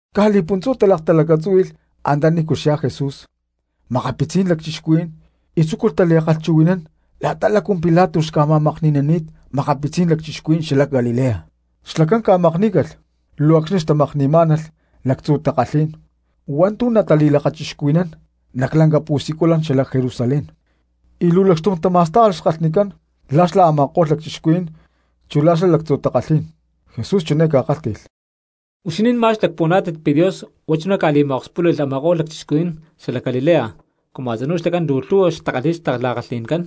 Caj li̠puntzú talaktalacatzúhui̠lh antanícu xyá Jesús makapitzí̠n lacchixcuhuí̠n y tzúculh tali̠ta̠kalhchuhui̠nán la̠ta lácu Pilato xca̠ma̠makni̠ni̠nani̠t makapitzí̠n lacchixcuhuí̠n xalac Galilea; xlacán ca̠makní̠calh luu acxni̠ xtamakni̠má̠nalh lactzu̠ takalhí̠n hua̠ntu̠ natali̠lakachixcuhui̠nán nac lanca pu̠siculan xalac Jerusalén, y luu lacxtum tama̠stájalh xkalhnicán la̠ xlá a̠ma̠ko̠lh lacchixcuhuí̠n chu xla lactzu̠ takalhí̠n. Jesús chiné ca̠kálhti̠lh: —¿Huixinín ma̠x lacpuhuaná̠tit pi̠ Dios huá chuná ca̠li̠ma̠okspúli̠lh a̠ma̠ko̠lh lacchixcuhuí̠n xalac Galilea cumu a̠tzinú xlacán luu lhu̠hua xtakalhi̠y xtala̠kalhi̠ncán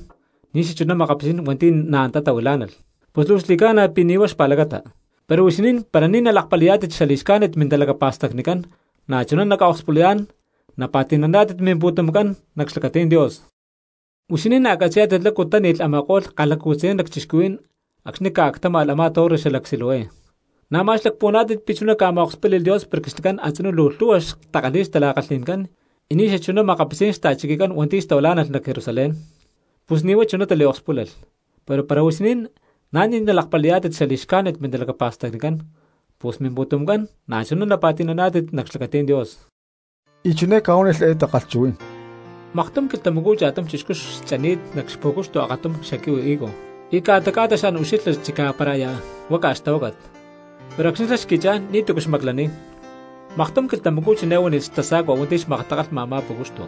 ni̠ xachuná makapitzí̠n hua̠nti̠ na̠ antá tahuilá̠nalh? Pus luu xli̠ca̠na pi̠ ni̠ huá xpa̠lacata, pero huixinín para ni̠ nalakpali̠yá̠tit xali̠xcájnit mintalacapa̠stacnicán na̠chuná naca̠okspulayá̠n napa̠ti̠naná̠tit mimpu̠tumcán nac xlacatí̠n Dios. Huixinín na̠ catzi̠yá̠tit lácu táni̠lh a̠ma̠ko̠lh kalhacu̠tzayán lacchixcuhuí̠n acxni̠ ca̠actáma̠lh a̠má torre xalac Siloé; ¿na̠ ma̠x lacpuhuaná̠tit pi̠ chuná ca̠ma̠okspúli̠lh Dios porque xlacán a̠tzinú luu lhu̠hua xtakalhi̠y xtala̠kalhi̠ncán y ni̠ xachuná makapitzí̠n xta̠chiquicán hua̠nti̠ xtahuilá̠nalh nac Jerusalén? Pus ni̠ huá chuná taliokspúlalh, pero para huixinín na̠ ni̠ nalakpali̠yá̠tit xali̠xcájnit mintalacapa̠stacnicán, pus mimpu̠tumcán na̠chuná napa̠ti̠naná̠tit nac xlacatí̠n Dios. Y chiné ca̠huánilh eé takalhchuhuí̠n: —Maktum quilhtamacú cha̠tum chixcú xchani̠t nac xpu̠cuxtu akatum xaquihui higo y ca̠ta ca̠ta xan ucxilha chicá para aya huaca xtahuácat, pero acxni̠ xlá xqui̠chá̠n ni̠tu̠cu xmaclaniy. Maktum quilhtamacú chiné huánilh xtasa̠cua hua̠nti̠ xmaktakalha a̠má pú̠cuxtu: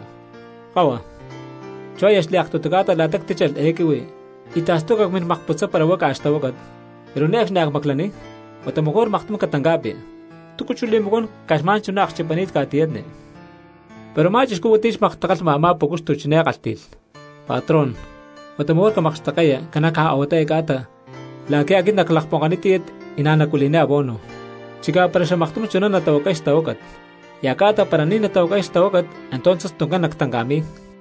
“Kahua, chú aya xliaktutu ca̠ta la̠ta ctíchalh eé quihui y tastuca cmin makputzay para huaca xtahuácat, pero ne̠cxni a̠ cmaclaniy; huata mejor maktum catanca̠pi. ¿Túcu chú li̠macuán caj xma̠n chuná akchipani̠t ca̠tiyatni?” Pero a̠má chixcú hua̠nti̠ xmaktakalhma a̠má pú̠cuxtu chiné kálhti̠lh: “Patrón, huata mejor camakxtekke̠ya ca̠na caj a̠huatá eé ca̠ta la̠qui̠ aquit naclakponkaniy tíyat y na̠ nacuili̠niy abono. Chicá para xamaktum chuná natahuacay xtahuácat, y a̠ca̠ta para ni̠ natahuacay xtahuácat entonces tuncán nactanca̠mi̠y.”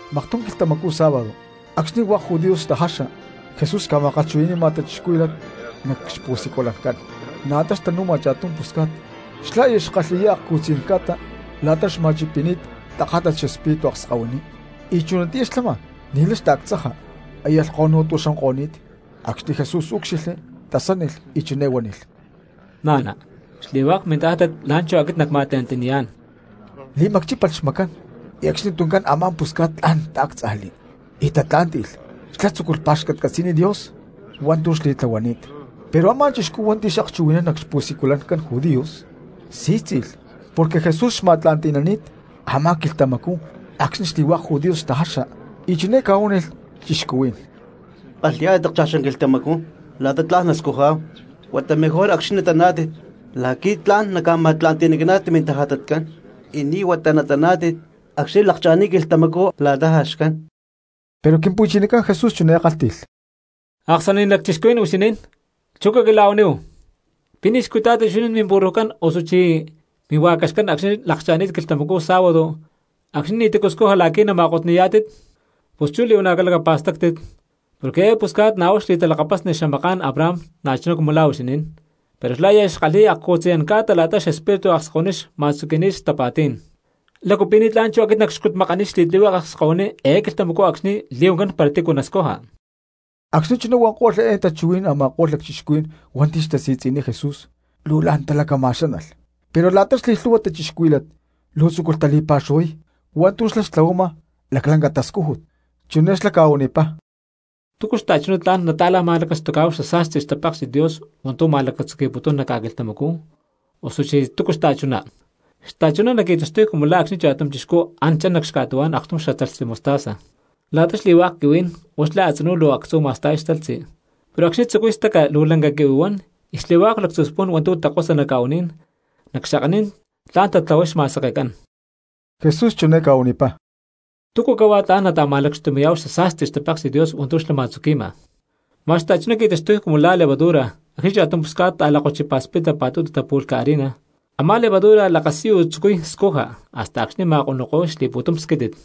Maktum quilhtamacú sábado acxni̠ hua̠k judíos xtajaxa, Jesús xca̠ma̠kalhchuhui̠ni̠ma cristianos nac xpu̠siculancán. Na̠ antá xtanu̠ma cha̠tum pusca̠t, xlá aya xkalhi̠yá akcu̠tzayán ca̠ta la̠ta xma̠chipi̠ni̠t tajátat xespíritu akskahuiní, y chunatiyá xlama ni̠lay xtaactzaja aya lhkonu̠tua xuanko̠ni̠t. Acxni̠ Jesús úcxilhli, tasánilh y chiné huánilh: —Na̠na, xli̠hua̠k mintajátat la̠nchú aquit nacma̠tla̠nti̠niyá̠n. Li̠macchípalh xmacán, y acxni tuncán a̠má pusca̠t tla̠n taáctzajli y tatlá̠nti̠lh, xlá tzúculh pa̠xcatcatzi̠niy Dios hua̠ntu̠ xli̠tlahuani̠t. Pero a̠má chixcú hua̠nti̠ xakchuhui̠nán nac xpu̠siculancán judíos sí̠tzi̠lh porque Jesús xma̠tla̠nti̠nani̠t a̠má quilhtamacú acxni̠ xli̠hua̠k judíos xtajaxa, y chiné ca̠huánilh cristianos: —Kalhi̠yá̠tit akcha̠xán quilhtamacú la̠ta lácu hua̠k tla̠n nascujá̠hu, huata mejor acxni̠ nataná̠tit la̠qui̠ tla̠n naca̠ma̠tla̠nti̠nicaná̠tit mintajatatcán, y ni̠ huata acxni̠ nataná̠tit acxni̠ lakcha̠ni̠t quilhtamacú la̠ta lácu jaxcán. Pero Quimpu̠chinacán Jesús chiné kálhti̠lh: —¡Aksani̠naní̠n lacchixcuhuí̠n huixinín! Chú caquila̠huaníhu, ¿Pi̠ ni̠ xcutá̠tit huixinín miburrujcán osuchí mihua̠caxcán acxni̠ lakcha̠ni̠t quilhtamacú sábado acxni̠ ni̠ti̠cu scuja la̠qui̠ nama̠kotni̠yá̠tit? Pus chú li̠huana̠ calacapa̠stáctit, porque eé pusca̠t na̠ huá xli̠talakapasni xamaká̠n Abraham na̠chuná cumu la̠ huixinín, pero xlá aya xkalhi̠y akcu̠tzayán ca̠ta la̠ta xespíritu akskahuiní xma̠tzuqui̠ni̠t xtapa̠tí̠n, ¿lácu pi̠ ni̠tlá̠n chú aquit nacxcutmakaniy xli̠tlihueke akskahuiní eé quilhtamacú acxni̠ li̠huancán para tícu nascuja? Acxni̠ chuná huanko̠lh eé tachuhuí̠n a̠ma̠ko̠lh lacchixcuhuí̠n hua̠nti̠ xtasi̠tzi̠niy Jesús luu la̠n talacama̠xánalh; pero la̠ta xli̠lhu̠hua cristianos luu tzúculh tali̠pa̠xuhuay hua̠ntu̠ xlá xca̠tlahuama laclanca xtascújut. Chiné xlá ca̠huanipá: —¿Túcu xta̠chuná tla̠n nata̠ma̠lacastucá̠hu xasa̠sti xtapáksi̠t Dios hua̠ntu̠ ma̠tzuqui̠putún nac ca̠quilhtamacú, osuchí túcu xta̠chuná? Xta̠chuná naqui̠taxtuy cumu la̠ acxni̠ cha̠tum chixcú an chan nac xca̠tuhuá̠n aktum xatalhtzi mostaza. La̠ta xli̠hua̠k quihuí̠n huá xlá a̠tzinú luu actzú ma̠sta̠y xtalhtzi, pero xlá acxni̠ tzucuy staca luu lanca quihui huan y xli̠hua̠k lactzu̠ spu̠n hua̠ntu̠ takosa nac ca̠u̠ní̠n, nac xakaní̠n tla̠n tatlahuay xma̠sekecán. Jesús chiné ca̠huanipá: —¿Túcu cahuá tla̠n nata̠malacxtumi̠yá̠hu xasa̠sti xtape̠ksi̠t Dios hua̠ntu̠ xlá ma̠tzuqui̠ma? Ma̠x xta̠chuná qui̠taxtuy cumu la̠ a̠má levadura, acxni̠ cha̠tum pusca̠t ta̠lakkochipa̠spita pa̠tutu tapu̠lhca harina, a̠má levadura lakasiyu tzucuy scuja hasta acxni̠ nama̠konuko̠y xli̠pu̠tum squítit.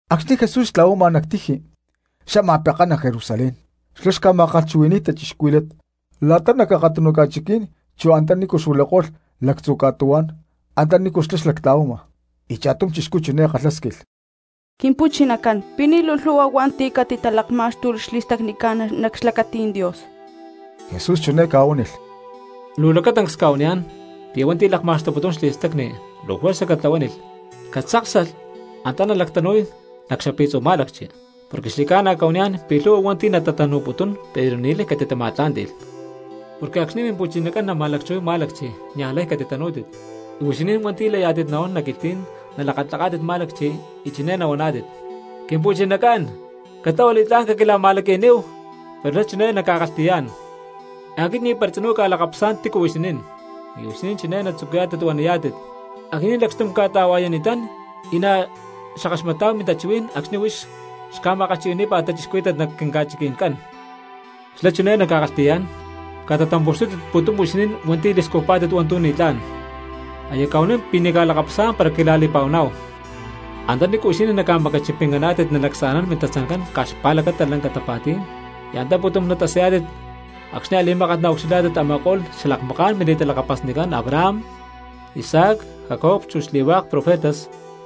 Acxni̠ Jesús xtla̠huama nac tiji xama pekán nac Jerusalén, xlá xca̠ma̠kalhchuhui̠ni̠y cristianos la̠ta nac akatunu ca̠chiquí̠n chu antanícu xuilako̠lh lactzu̠ ca̠tuhuá̠n antanícu xlá xlactla̠huama. Y cha̠tum chixcú chiné kalhásquilh: —Quimpu̠chinacán, ¿pi̠ ni̠ luu lhu̠hua hua̠nti̠ catitalakmá̠xtulh xli̠stacnicán nac xlacatí̠n Dios? Jesús chiné ca̠huánilh: —Luu lacatancs cca̠huaniyá̠n pi̠ hua̠nti̠ lakma̠xtuputún xli̠stacni luu juerza catlahuánilh catzáksalh antá nalactanu̠y nac xapi̠tzu̠ má̠lacchi. Porque xli̠ca̠na cca̠huaniyá̠n pi̠ lhu̠hua hua̠nti̠ natatanu̠putún pero ni̠lay catitama̠tlá̠nti̠lh. Porque acxni̠ Mimpu̠chinacán nama̠lacchuhuay má̠lacchi niaj lay catitanú̠tit. Y huixinín hua̠nti̠ layá̠tit nahuán nac quilhtí̠n nalakatlaká̠tit má̠lacchi y chiné nahuaná̠tit: “Quimpu̠chinacán, catlahua li̠tlá̠n caquila̠ma̠laqui̠níhu.” Pero xlá chiné naca̠kalhti̠yá̠n: “Aquit ni̠para tzinú cca̠lakapasá̠n tícu huixinín.” Y huixinín chiné natzucuyá̠tit huaniyá̠tit: “Aquinín lacxtum cca̠ta̠hua̠yani̠tán y na̠ xackaxmatá̠hu mintachuhuí̠n acxni̠ huix xca̠ma̠kalhchuhui̠ní̠pa̠t cristianos nac quinca̠chiqui̠ncán.” Xlá chiné naca̠kalhti̠yá̠n: “¡Catatampu̠xtútit uú pu̠tum huixinín hua̠nti̠ li̠scujpá̠tit hua̠ntu̠ ni̠tlá̠n! Aya cca̠huanín pi̠ ni̠ cca̠lakapasá̠n para quila̠li̠pa̠huaná̠hu.” Antanícu huixinín naca̠macachipincaná̠tit nalacsa̠nán mintatzancán caj xpa̠lacata lanca tapa̠tí̠n, y antá pu̠tum natasayá̠tit acxni̠ a̠li̠mákat naucxilhá̠tit a̠ma̠ko̠lh xalakmaká̠n mili̠talakapasnicán Abraham, Isaac, Jacob chu xli̠hua̠k profetas,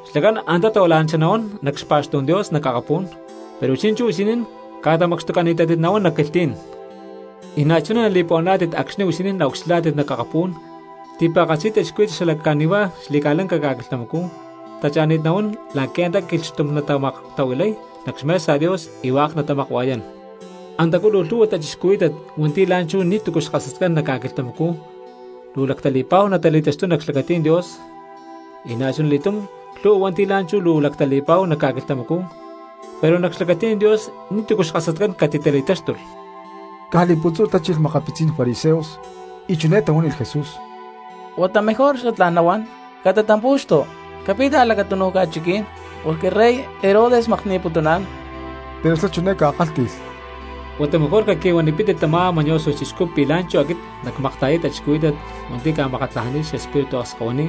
xlacán antá tahuila̠nanchá nahuán nac xpa̠xtú̠n Dios nac akapú̠n, pero chi̠nchú huixinín ca̠tamacxtucani̠tántit nahuán nac quilhtí̠n. Y na̠chuná nali̠puhuaná̠tit acxni̠ huixinín naucxilhá̠tit nac akapú̠n ti̠pa̠katzi cristianos xala cani̠huá xli̠ca̠lanca ca̠quilhtamacú tacha̠ni̠t nahuán la̠qui̠ antá quilhxtum natamaktahuilay nac xmesa Dios y hua̠k natamakua̠yán. Antacú luu lhu̠hua cristianos hua̠nti̠ la̠nchú ni̠tu̠cu xkasatcán nac ca̠quilhtamacú luu lactali̠pa̠huá natali̠taxtuy nac xlacatí̠n Dios, y na̠chuna li̠túm lhu̠hua hua̠nti̠ la̠nchú luu lactali̠pa̠hu nac ca̠quilhtamacú pero nac xlacatí̠n Dios ni̠tu̠cu xkasatcán catitali̠táxtulh. Caj li̠puntzú tachilh makapitzí̠n fariseos y chiné tahuánilh Jesús: —Huata mejor xatlá̠n nahuán catatampu̠xtu capit a̠lacatunu ca̠chiquí̠n porque rey Herodes makni̠putuná̠n. Pero xlá chiné ca̠kálhti̠lh: —Huata mejor caqui̠huanipítit tamá mañoso chixcú pi̠ la̠nchú aquit nacca̠makta̠yay cristianos hua̠nti̠ ca̠makatlajani̠t xespíritu akskahuiní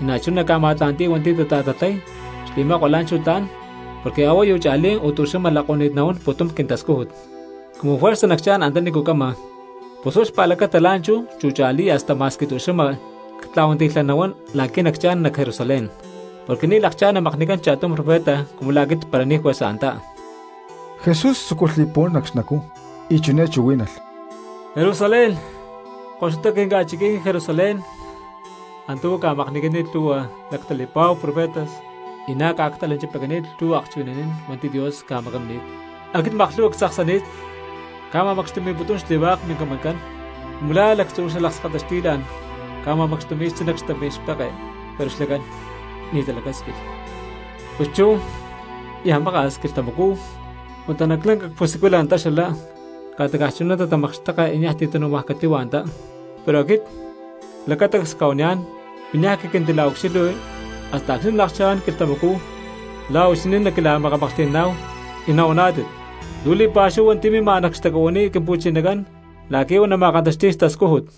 y na̠chuná nacca̠ma̠tla̠nti̠y hua̠nti̠ tata̠tatlay xli̠makua la̠nchú tla̠n, porque a̠huayu cha̠lí o tu̠xama lako̠ni̠t nahuán pu̠tum quintascújut. Cumu juerza nacchá̠n antanícu cama, pus huá xpa̠lacata la̠nchú chu cha̠lí y hasta ma̠x tu̠xama ctla̠huanti̠lhay nahuán la̠qui̠ nacchá̠n nac Jerusalén, porque ni̠ lakchá̠n namakni̠cán cha̠tum profeta cumu la̠ aquit para ni̠ juerza antá. Jesús tzúculh li̠puhuán nac xnacú y chiné chuhuí̠nalh: —¡Jerusalén, koxutacú quinca̠chiquí̠n Jerusalén! Antá uú ca̠makni̠cani̠t lhu̠hua luu lactali̠pa̠hu profetas y na̠ ca̠actalanchipacani̠t lhu̠hua akchuhui̠naní̠n hua̠nti̠ Dios ca̠macamini̠t. Aquit maklhu̠hua ctzaksani̠t cca̠ma̠macxtumi̠putún xli̠hua̠k mincamancán, cumu la̠ lactzú xalakskata xti̠la̠n ca̠ma̠macxtumi̠y xtzí nac xtampí̠n xpeke, pero xlacán ni̠ talacásquilh. Pus chú niaj maka̠s quilhtamacú huata nac lanca pusiculan antá xala, ca̠ta caj chunatá natatamakxteka y niaj ti̠ tanu̠maj catíhua antá. Pero aquit lacatancs cca̠huaniyá̠n pi̠ niaj caquintila̠ucxilhui hasta acxni̠ nalakchá̠n quilhtamacú la̠ huixinín naquila̠makamaklhti̠naná̠hu y nahuaná̠tit: “¡Luu li̠pa̠xúhu hua̠nti̠ mima nac xtacuhuiní Quimpu̠chinacán la̠qui̠ huá nama̠kantaxti̠y xtascújut!”